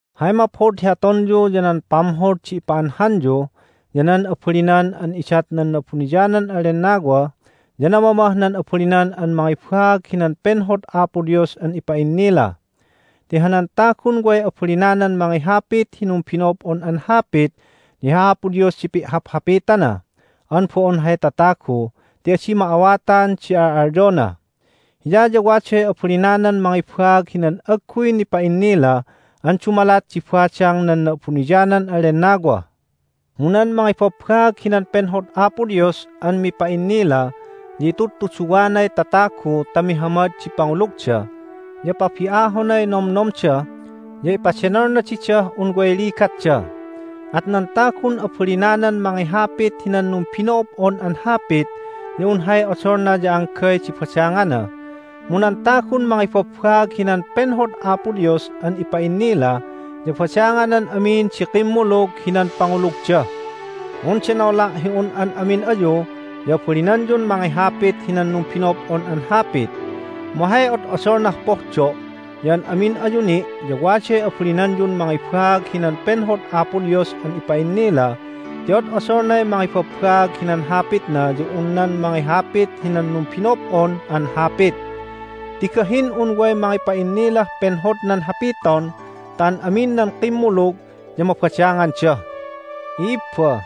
Hay maphod hi atonyu ya nan pamhod di ipa'anhanyu, ya nan abalinan an idat nan Na'abuniyanan an Lennawa, ya namamah nan abalinan an mangibaag hinan penhod Apo Dios an ipa'innila. Ti hanan tagun way abalinanan mangihapit hi numbino'ob'on an hapit ya hi Apo Dios di pi'haphapitana an bo'on hay tatagu ti adi ma'awatan di al'alyona. Hiya ya waday abalinanan mangibaag hinan agguy nipa'innila an dumalat di badang nan Na'abuniyanan an Lennawa. Mu nan mangibabbaag hinan penhod Apo Dios an mipa'innila ya itudtuduwanay tatagu ta mihamad di pangulugda, ya pabi'ahonay nomnomda, ya ipadenolna didah un way ligatda. At nan tagun abalinanan mangihapit hinan numbino'ob'on an hapit ya un hay odolna ya anggay di badangana, mu nan tagun mangibabbaag hinan penhod Apo Dios an ipa'innila ya badanganan amin di kimmulug hinan pangulugda. Mundenola' hi un an amin ayu ya abalinanyun mangihapit hinan numbino'ob'on an hapit! Mu hay od'odolnah pohdo' ya an amin ayu ni' ya waday abalinanyun mangibaag hinan penhod Apo Dios an ipa'innila ti od'odolnay mangibabbaag hinan Hapitna ya un nan mangihapit hinan numbino'ob'on an hapit. Ti gahin un way mangipa'innilah penhodnan hapiton ta an amin nan kimmulug ya mabadanganda. I'ibba,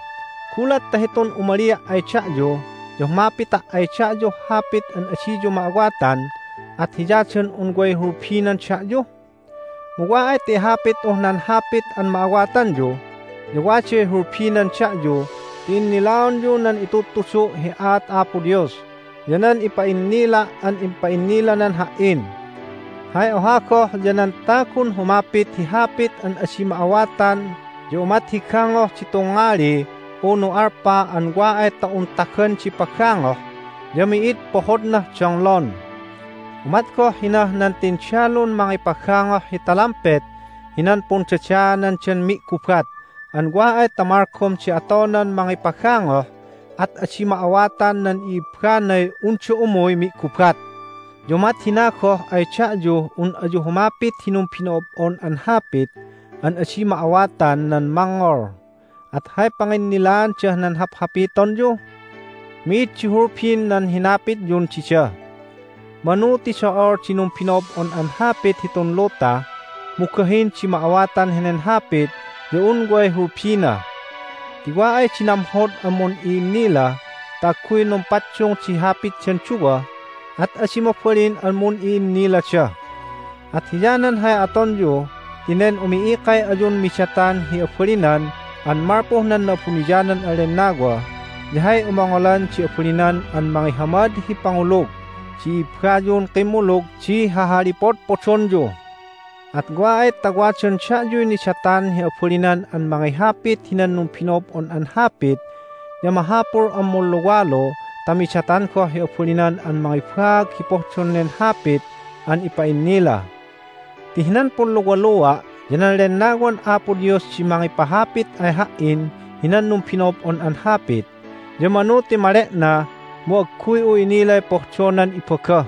gulat ta hitun umalia' ay da'yu ya humapita' ay da'yuh hapit an adiyu ma'awatan at hiyadan un way hulbinan da'yu? Mu wa ay ta ihapit'uh nan hapit an ma'awatanyu ya waday hulbinan da'yu ti innilaonyu nan itudtudu' hi aat Apo Dios ya nan ipa'innila' an impa'innilanan ha"in. Hay oha goh ya nan tagun humapit hi hapit an adi ma'awatan umat hi ya gangoh di tungngali unu alpa an wa ay ta un tagan di pagangoh ya mi'id pohodnah donglon. Umat goh hinah nan tindalun mangipagangoh hi talampet hinan pundadaanandan mi'gubat an wa ay ta malgom di atonan mangipagangoh at adi ma'awatan nan i'ibbanay unda umuy mi'gubat. Ya umat hina goh ay da'yuh un ayu humapit hi numbino'ob'on an hapit an adi ma'awatan nan mangngol, at hay panginnilaandah nan haphapitonyu? Mi'id di hulbin nan hinapityun dida! Manu ti do'ol di numbino'ob'on an hapit hitun luta, mu gahin di ma'awatan henen hapit ya un way hulbina. Ti wa ay di namhod an mun'i'innila ta agguy numpaddung di hapitdan duwa at adi mabalin an mun'i'innilada. At hiyanan hay atonyu ti nen umi'ikay ayun midatan hi abalinan an malpuh nan Na'abuniyanan an Lennawa ya hay umongolan di abalinan an mangihamad hi pangulug di i'ibbayun kimmulug di hahalipodpodonyu. At wa ay ta wadan da'yuy nidatan hi abalinan an mangihapit hinan numbino'ob'on an hapit ya mahapul an munluwalu ta midatan goh hi abalinan an mangibaag hi pohdon nen hapit an ipa'innila. Ti hinan punluwalua' ya nan Lennawan Apo Dios di mangipahapit ay ha"in hinan numbino'ob'on an hapit, ya manu ti male'na mu agguy'u inilay pohdonan ibaga.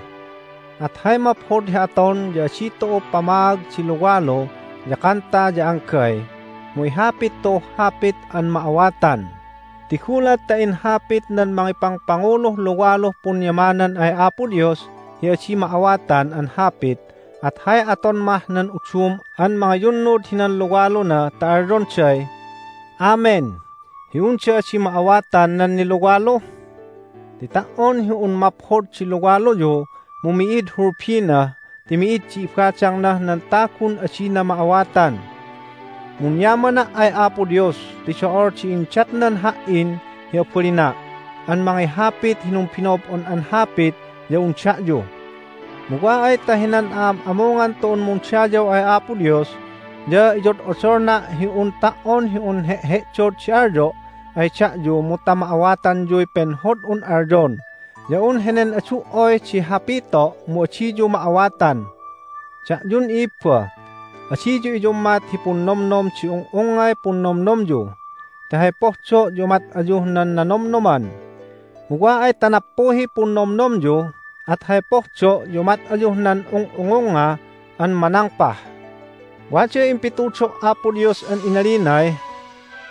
At hay maphod hi aton ya adi tu'u pamaag di luwalu ya kanta ya anggay, mu ihapit tu'uh hapit an ma'awatan ti gulat ta inhapit nan mangipangpanguluh luwaluh punyamanan ay Apo Dios hi adi ma'awatan an hapit at hay aton mah nan udum an mangiyunnud hinan luwaluna ta alyonday, "Amen!" hi unda adi ma'awatan nan niluwalu? Ti ta"on hi un maphod di luwaluyu mu mi'id hulbina ti mi'id di ibadangnah nan tagun adina ma'awatan. Munyamana' ay Apo Dios ti do'ol di indatnan ha"in hi abalina' an mangihapit hi numbino'ob'on an hapit ya un da'yu. Mu wa ay ta hinan a'am'amungan tu'un mundayaw ay Apo Dios ya iyod'odolna' hi un ta"on hi un he'he'dod di alyo' ay da'yu mu ta ma'awatanyuy penhod'un alyon ya un henen adu"oy di hapito' mu adiyu ma'awatan. Da'yun i'ibba, adiyu iyummat hi punnomnom di ung'ungngay punnomnomyu ti hay pohdo' ya umat ayuh nan nanomnoman. Mu wa ay ta nappuhiy punnomnomyu at hay pohdo' ya umat ayuh nan ung'ungungnga an manangpah. Waday impitudo' Apo Dios an inalinay,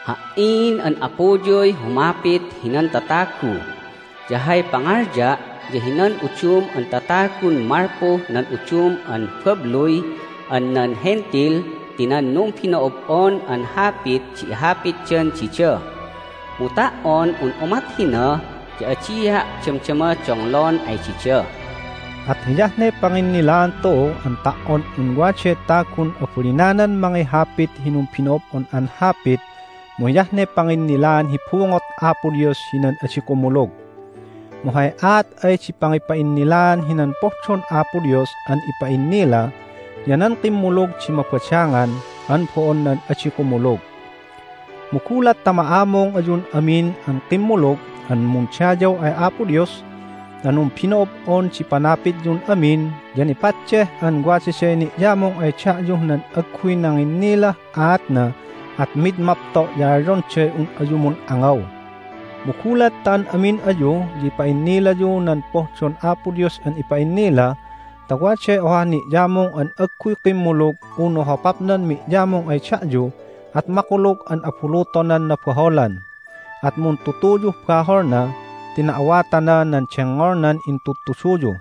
"Ha"in an Apuyuy humapit hinan tatagu', ya hay pangalya' ya hinan udum an tatagun malpuh nan udum an babluy an nan Hentil ti nan numbino'ob'on an hapit di ihapitdan dida, mu ta"on un umat hina ya adia' damdama donglon ay dida." At hiyah ne panginnilaan tu'u an ta"on un waday tagun abalinanan mangihapit hi numbino'ob'on an hapit mu hiyah ne panginnilaan hi bungot Apo Dios hinan adi kumulug. Mu hay aat ay di pangipa'innilaan hinan pohdon Apo Dios an ipa'innila ya nan kimmulug di mabadangan an bo'on nan adi kumulug. Mu gulat ta ma'amung ayun amin an kimmulug an mundayaw ay Apo Dios ta numbino'ob'on di panapityun amin ya nipaddeh an wadaday ni'yamung ay da'yuh nan agguy nanginnilah aatna at mid mapto' ya alyonday un ayu mun'angaw. Mu gulat ta an amin ayu ya ipa'innilayu nan pohdon Apo Dios an ipa'innila ta waday ohah ni'yamung an agguy kimmulug unu hopapnan mi'yamung ay da'yu at makulug an abulutonan nabaholan, at muntutuyuh baholna ti na'awatana nan dengngolnan intudtuduyu.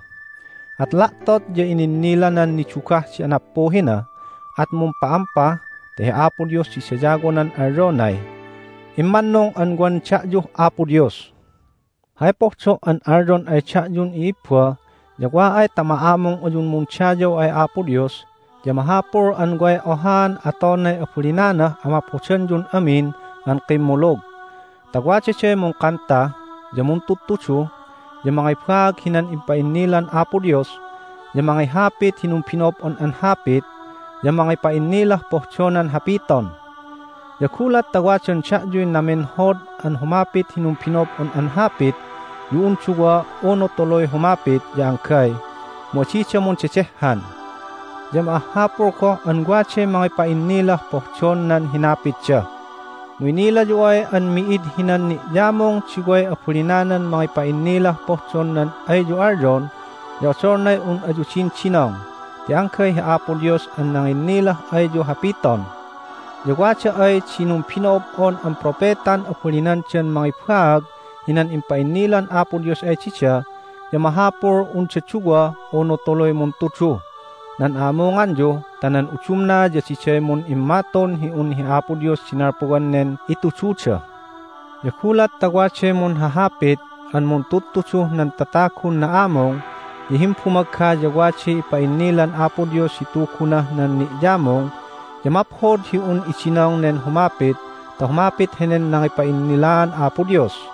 At la'tot ya ininnilanan nidugah di anappuhina, at mumpa'ampa ta hi Apo Dios di dayawonan alyonay, "Immannung an wan da'yuh Apo Dios!" Hay pohdo' an alyon ay da'yun i'ibba ya wa ay ta ma'amung ayun mundayaw ay Apo Dios ya mahapul an way ohaan atonay abalinanah amaphodanyun amin an kimmulug. Ta wadaday mungkanta, ya muntudtudu, ya mangibaag hinan impa'innilan Apo Dios, ya mangihapit hi numbino'ob'on an hapit, ya mangipa'innilah pohdonan hapiton. Ya gulat ta wadan da'yuy namenhod an humapit hi numbino'ob'on an hapit ya un duwa unu tuluy humapit ya anggay, mu adida mundedehhan. Ya ma'ahhapul goh an waday mangipa'innilah pohdon nan hinapitda. Mu inilayu ay an mi'id hinan ni'yamung di way abalinanan mangipa'innilah pohdon nan ayyu alyon ya odolnay un ayu didindinong ti anggay hi Apo Dios an nanginnilah ayyu hapiton. Ya wada ay di numbino'ob'on an propetan abalinandan mangibaag hinan impa'innilan Apo Dios ay dida ya mahapul unda duwa unu tuluy muntuduh nan a'amunganyu ta nan udumna ya diday mun'immatun hi un hi Apo Dios di nalpuwan nen itududa. Ya gulat ta waday munhaphapit an muntudtuduh nan tatagun na'amung ya himbumagga ya waday ipa'innilan Apo Dios hi Tugunah nan ni'yamung ya maphod hi un idinong nen humapit ta humapit henen nangipa'innilaan Apo Dios.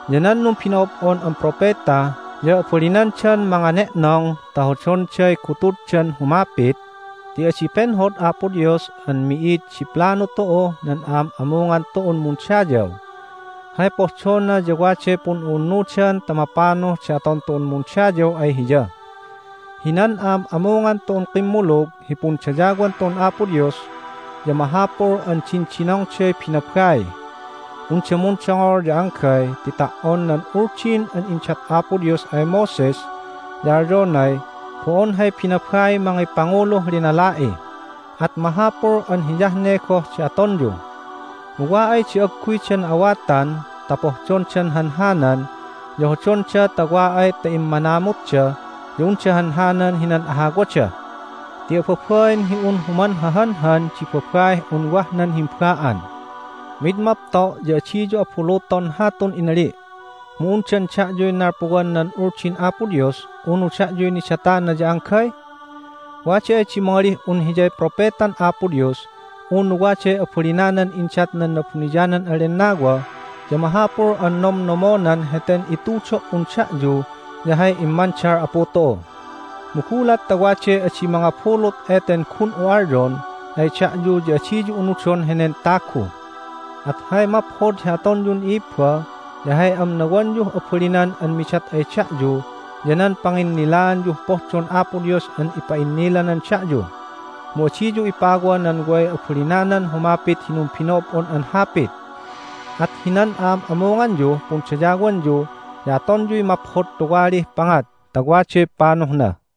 Ya nan numbino'ob'on an propeta ya abalinandan mangane'nong ta hodonday gutuddan humapit ti adi penhod Apo Dios an mi'id di planu tu'uh nan a'am'amungan tu'un mundayaw. Hay pohdona ya waday pun'u'unnudan ta mapanuh di aton tu'un mundayaw ay Hiya. Hinan a'am'amungan tu'un kimmulug hi pundayawan tu'un Apo Dios ya mahapul an dindinongday binabai. Unda mundongol ya anggay ti ta"on nan Uldin an indat Apo Dios ay Moses ya alyonay bo'on hay binabaiy mangipanguluh linala'i. At mahapul an hiyah ne goh di atonyu. Mu wa ay di agguyda na'awatan ta pohdondan hanhanan ya hodonda ta wa ay ta immanamutda ya unda hanhanan hinan ahawada. Ti ababain hi un humanhahanhan di babaih un wah nan himba'an. Mid mapto' ya adiyu abuluton hatun inali'. Mu undan da'yuy nalpuwan nan Uldin Apo Dios, unu da'yuy nidatana ya anggay? Wada ay di mangalih un hiyay propetan Apo Dios unu waday abalinanan indat nan Na'abuniyanan an Lennawa ya mahapul an nomnomonan heten itudo"un da'yu ya hay immandal Apu tu'u. Mu gulat ta waday adi mangabulut eten gun'u alyon ay da'yu ya adiyu unudon henen tagu. At hay maphod hi atonyun i'ibba ya hay amnawanyuh abalinan an midat ay da'yu ya nan panginnilaanyuh pohdon Apo Dios an ipa'innilanan da'yu. Mu adiyu ipawa nan way abalinanan humapit hi numbino'ob'on an hapit. At hinan a'am'amunganyuh pundayawanyu ya atonyuy maphod tuwalih pangat ta waday panuhna.